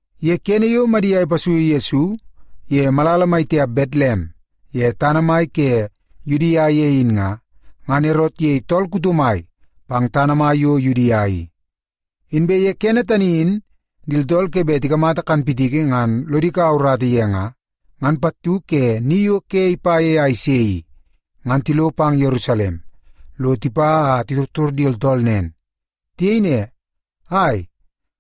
Ye kene yo Madia ipasuiu Yesu ye malala mai tiap Betlem ye tana mai ke Yudia ye in nga, ngan Erot iyei tool kuto mai pang tana mai yo Yudia i. Inbe ye kene tani in di tooltool ke bet tikamata kanpitiki ngan lodi kaua urata ye nga, ngan pattu ke ni yo ke ipa ye a ise i, ngan tilo pang Yerusalem lo tipa a titortor di tooltool nen. Tiyei ne, “Ai,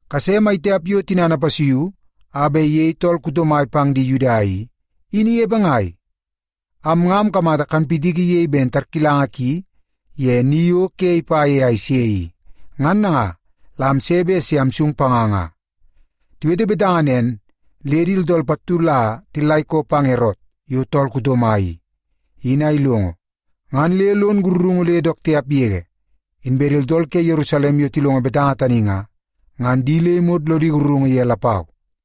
kase mai tiap yo tinana ipasuiu a bet iyei tool kuto mai pang di Yuda i, in inepe ngai? Am nga amkamata kanpitiki iyei ben tarkilanga ki ye ni yo ke ipa ye a ise i, ngan nanga la amse bet se amsung panga nga.” Tiwete betanga nen, le di tooltool pattu la tillaikoodi pang Erot yo tool kuto mai i, in a ilongo, ngan le lon sakarungu le dook tiap yege. Inbe di tooltool ke Yerusalem yo tilongo betanga tani nga, ngan di le imot lodi sakarungu ye lapau.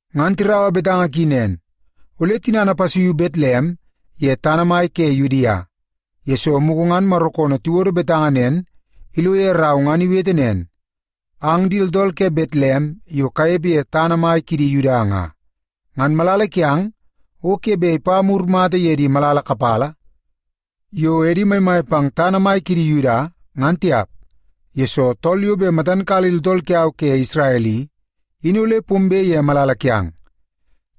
Ngan tiraua betanga ki nen, “Ole tinana ipasuiu Betlem ye tana mai ke Yudia, yesoo mugu ngan Maro koonoo iwodo betanga nen ilo ye rau ngan iwete nen, ‘Ang di tooltool ke Betlem yo kanepe ye tana mai kidi Yuda nga, ngan malala kiang o ke bet ipa mur mata ye di malala kapala yo edi maimai pang tana mai kidi Yuda, ngan tiap, yesoo tool yo bet matan kala di tooltool kiau ke Isrel i, in ole pombe ye malala kiang.’”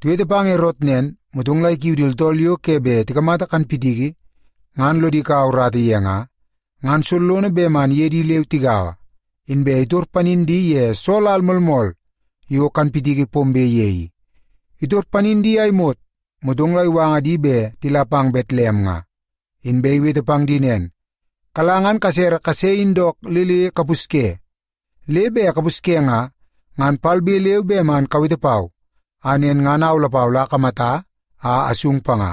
Tiwete pang Erot nen, motong la ikiu di tooltool yo ke bet tikamata kanpitiki ngan lodi kaua urata ye nga, ngan sollono bet man iye di leu tigaua, inbe itor panin di ye soo lal moolmool yo kanpitiki pombe ye i. Itor panin di a imot, motong la iwanga di bet tila pang Betlem nga. Inbe iwete pang di nen, “Kala ngan kasere kase in dook le le kapusye. Le bet kapusye nga, ngan palbe leu be man kawete pau a nen ngan au lapau la akamata, a asung panga.”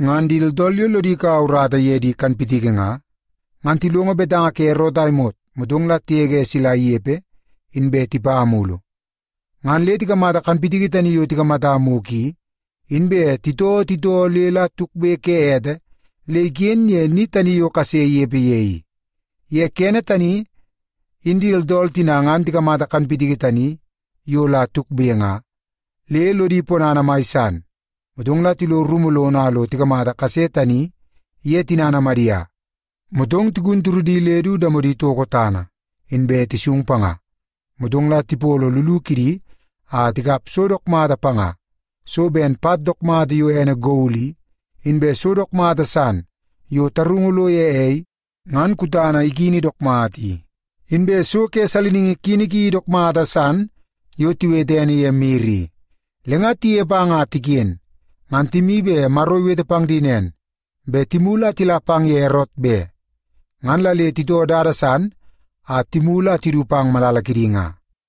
Ngan di tooltool yo lodi kaua urata ye di kanpitiki nga, ngan tilongo betanga ke Erot a imot, motong la tigege sila inepe, inbe tipa mulu. Ngan le tikamata kanpitiki tani yo tikamata mugu i, inbe titoo titoo le la tukbe ke ete le iken ye ni tani yo kase inepe ye i. Ye kene tani, in di tooltool tina ngan tikamata kanpitiki tani yo la tukbe nga, le lodi ponana mai san. Motong la tilo rumu lono a lo tikamata kase tani iye tinana Madia, motong tigun turudi le du damodi toko tana, inbe tisung panga. Motong la tipolo llugu kidi a tikap so dook mata panga; so ben pat dook mata yo ene gol i, inbe so dook mata san yo tarungu lo ye ei ngan kutana ikini dook mata i, inbe so ke saliningi kini ki dook mata san yo tiwete ene ye mir i. Le nga tinepe a nga tiken, ngan timi bet Maro iwete pang di nen, bet timulu a tila pang ye Erot be. Ngan la le titoo dada san a timulu a tidu pang ni kidi nga.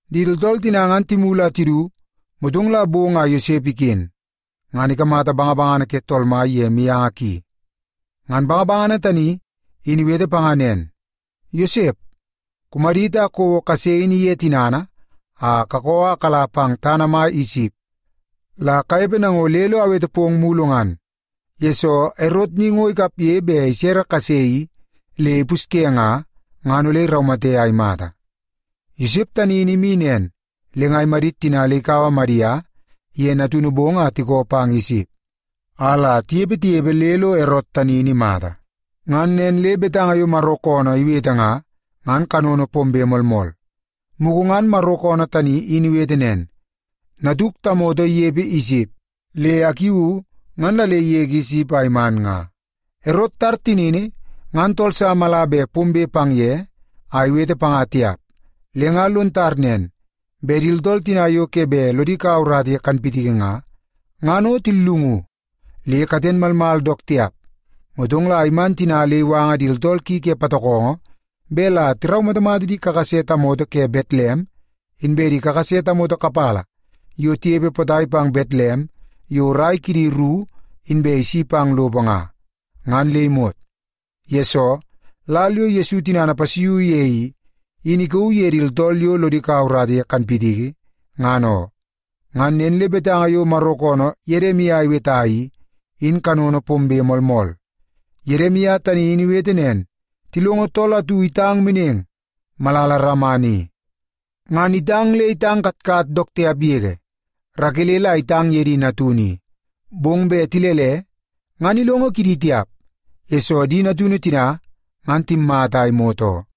Di tooltool tina ngan timulu a tidu, motong la bong a Yosep iken, ngan ikamata bangabangana ke Tool Mai ye mianga ki. Ngan bangabangana tani in iwete panga nen, “Yosep, kumadit a kouo kase in iye tinana a kakoo a kala pang tana mai Isip la kanepe nango le lo awete pong mulu ngan, yesoo Erot ni ngo ikapge bet isere kase i le ipusye nga, ngan ole iraumate a imata.” Yosep tani in imi nen, le nga imadit tina le ikaua Madia iye natunu bong a tikoo pang Isip, a la tinepe tinepe le lo Erot tani in imata. Ngan nen le betanga yo Maro koonoo iwete nga, ngan kanono pombe moolmool. Mugu ngan Maro koonoo tani in iwete nen, “Natuk tamoto inepe Isip, le akiuu ngan la le igege Isip a iman nga.” Erot itar tinini ngan tool sa mala bet pombe pang ye a iwete panga tiap. Le nga lon tar nen, bet di tooltool tina yo ke bet lodi kaua urata ye kanpitiki nga, ngan o tillungu, le katen malmal dook tiap. Motong la iman tina le iwanga di tooltool ki ke patokongo bet la tiraumatamata di kakase tamoto ke Betlem inbe di kakase tamoto kapala yo tinepe potai pang Betlem yo rai kidi ru inbe isi pang lopo nga, ngan le imot. Yesoo, lal yo Yesu tinana ipasuiu ye i, in ikauu ye di tooltool yo lodi kaua urata ye kanpitiki, ngan oo. Ngan nen le betanga yo Maro koonoo Yedimia iweta i, in kanono pombe moolmool. Yedimia tani in iwete nen, “Tilongo tool atu itang meneng malala Rama ni, ngan itang le itang katkat dook tiap yege. Rakele la itang ye di natunu i, bong bet tilele, ngan ilongo kidi tiap, yesoo di natunu tina ngan timmata a imot oo.”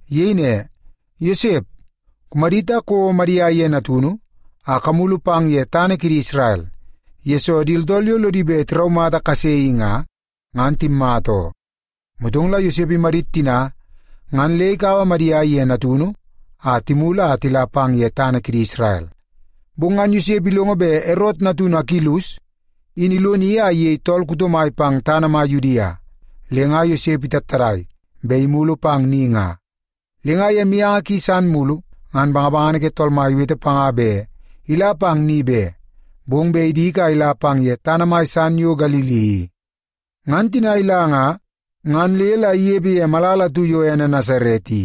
Iyei ne, “Yosep, kumadit a kouo Madia iye natunu a kamulu pang ye tana kidi Isrel, yesoo di tooltool yo lodi bet tiraumata kase i nga, ngan timmata oo.” Motong la Yosep imadit tina ngan le ikaua Madia iye natunu a timulu a tila pang ye tana kidi Isrel. Bong ngan Yosep ilongo bet Erot natunu Akilus in iloni a iyei tool kuto mai pang tana mai Yudia. Le nga Yosep itattadai bet imulu pang ni nga. Le ye mianga ki san mulu, ngan bangabangana ke Tool Mai iwete panga bet ila pang ni be, bong bet idik a ila pang ye tana mai san yo Galili i. Ngan tina ila nga, ngan le la inepe ye malala atu yo ene Nasaret i.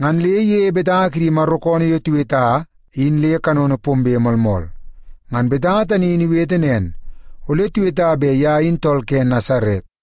Ngan le iyeie betanga kidi Maro koonoo yo tiweta in le kanono pombe moolmool. Ngan betanga tani in iwete nen, “Ole tiweta bet ye in tool ke Nasaret.”